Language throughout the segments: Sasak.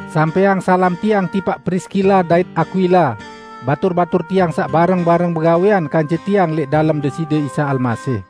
Sampẽang salam tiang tipaq Priskila dait Akwila, batur-batur tiang saq bareng-bareng bagawẽan kance tiang lẽq dalem Deside Isa Almasih.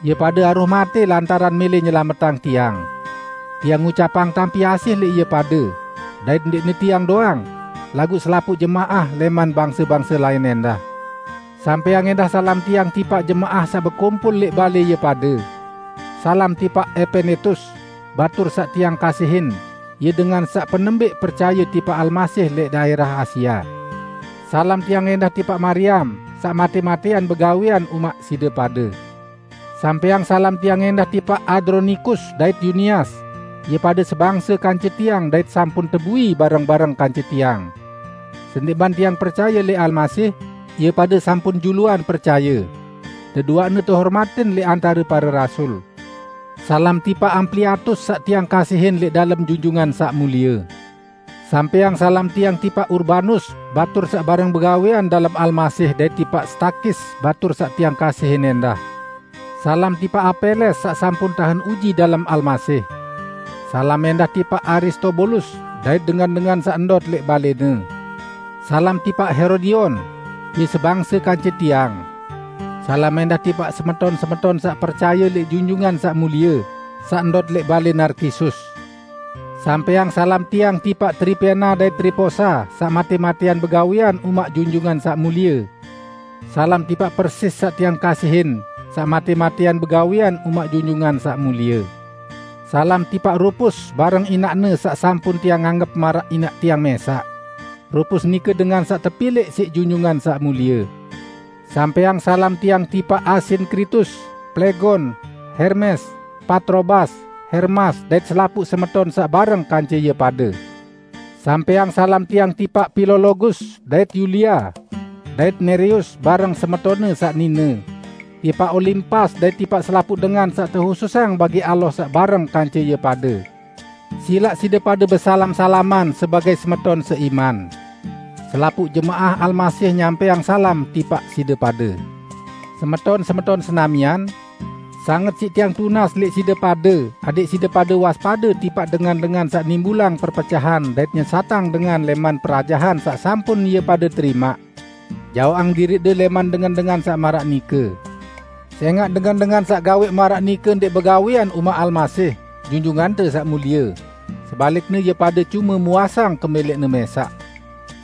Ie pade aroh matẽ lantaran mẽlẽ nyelametang tiang. Tiang ngucapang tampi asih lẽq ie pade -- dait ndẽqne tiang doang, laguq selapuq jemaah lẽman bangse-bangse lain ẽndah. Sampẽang ẽndah salam tiang tipaq jemaah saq bekumpul lẽq balẽ ie pade. Salam tipaq Epenetus, batur saq tiang kasihin, ie dengan saq penembẽq percaye tipaq Almasih lẽq daẽrah Asia. Salam tiang ẽndah tipaq Mariam saq matẽ-matẽan begawẽan umaq side pade. Sampẽang salam tiang ẽndah tipaq Andronikus dait Yunias, ie pade sebangse kance tiang dait sampun tebui bareng-bareng kance tiang. Sendẽqman tiang percaye lẽq Almasih, ie pade sampun juluan percaye. Deduaqne tehormatin lẽq antare pare rasul. Salam tipaq Ampliatus saq tiang kasihin lẽq dalem Junjungan Saq Mulie. Sampẽang salam tiang tipaq Urbanus, batur saq bareng begawẽan dalem Almasih dait tipaq Stakis batur saq tiang kasihin ẽndah. Salam tipaq Apeles saq sampun tahen uji dalem Almasih. Salam ẽndah tipaq Aristobulus dait dengan-dengan saq ndot lẽq balẽne. Salam tipaq Herodion. Ie sebangse kance tiang. Salam ẽndah tipaq semeton-semeton saq percaye lẽq Junjungan Saq Mulie, saq ndot lẽq balẽ Narkisus. Sampẽang salam tiang tipaq Tripena dait Triposa saq matẽ-matẽan begawẽan umaq Junjungan Saq Mulie. Salam tipaq Persis saq tiang kasihin, saq matẽ-matẽan begawẽan umaq Junjungan Saq Mulie. Salam tipaq Rupus bareng inaqne saq sampun tiang anggep maraq inaq tiang mẽsaq. Rupus nike dengan saq tepilẽq siq Junjungan Saq Mulie. Sampẽang salam tiang tipaq Asinkritus, Plegon, Hermes, Patrobas, Hermas dait selapuq semeton saq bareng kance ie pade. Sampẽang salam tiang tipaq Pilologus dait Yulia; dait Nereus bareng semetonne saq nine; tipaq Olimpas dait tipaq selapuq dengan saq tehususang bagi Allah saq bareng kance ie pade. Silaq side pade besalam-salaman sebagẽ semeton seiman. Selapuq jemaah Almasih nyampẽang salam tipaq side pade. Semeton-semeton senamian! Sanget siq tiang tunas lẽq side pade adẽq side pade waspade tipaq dengan-dengan saq nimbulang perpecahan dait nyesatang dengan lẽman perajahan saq sampun ie pade terimaq. Jaoqang diriqde lẽman dengan-dengan saq maraq nike. Sẽngaq dengan-dengan saq gawẽq maraq nike ndẽq begawẽan umaq Almasih, Junjungante Saq Mulie, sebalikne ie pade cume muasang kemẽlẽqne mẽsaq.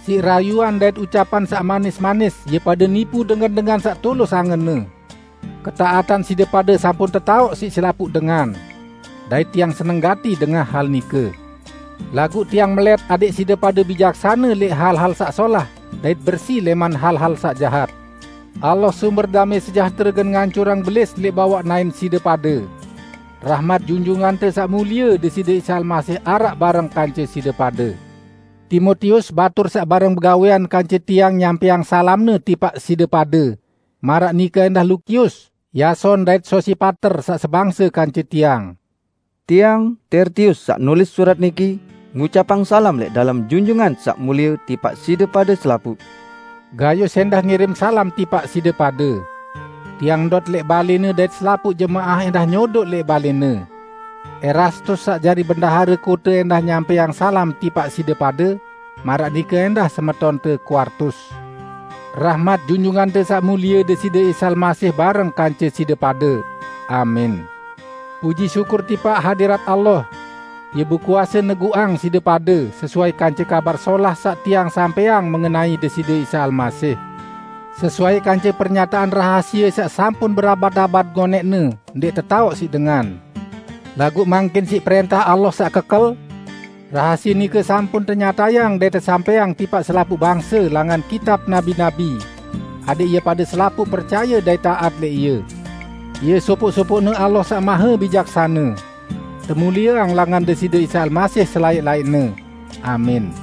Siq rayuan dait ucapan saq manis-manis, ie pade nipu dengan-dengan saq tulus angenne. Ketaatan side pade sampun tetaoq siq selapuq dengan. Dait tiang seneng gati dengah hal nike. Laguq tiang melẽt adẽq side pade bijaksane lẽq hal-hal saq solah, dait bersi lẽman hal-hal saq jahat. Allah sumber damẽ sejahtere gen ngancurang Belis lẽq bawaq naẽn side pade. Rahmat Junjungante Saq Mulie Deside Isa Almasih araq bareng kance side pade. Timotius, batur saq bareng begawẽan kance tiang nyampẽang salamne tipaq side pade, maraq nike ẽndah Lukius, Yason dait Sosipater saq sebangse kance tiang. Tiang, Tertius saq nulis surat niki, ngucapang salam lẽq dalem Junjungan Saq Mulie tipaq side pade selapuq. Gayus ẽndah ngirim salam tipaq side pade. Tiang ndot lẽq balẽne dait selapuq jemaah ẽndah nyodoq lẽq balẽne. Erastus saq jari bendahare kote ẽndah nyampẽang salam tipaq side pade, maraq nike ẽndah semetonte Kuartus. [ Rahmat Junjungante Saq Mulie Deside Isa Almasih bareng kance side pade. Amin.] Puji syukur tipaq hadirat Allah! Ie bekuase neguqang side pade, sesuai kance Kabar Solah saq tiang sampẽang mengenai Deside Isa Almasih, sesuai kance pernyataan rahasie saq sampun berabad-abad ngonẽqne ndẽq tetaoq siq dengan. Laguq mangkin siq prẽntah Allah saq kekel, rahasie nike sampun tenyatayang dait tesampẽang tipaq selapuq bangse langan kitab nabi-nabi, adẽq ie pade selapuq percaye dait taat lẽq Ie. Ie sopoq-sopoqne Allah Saq Mahebijaksane. Temulieang langan Deside Isa Almasih selaẽq-laẽqne! Amin.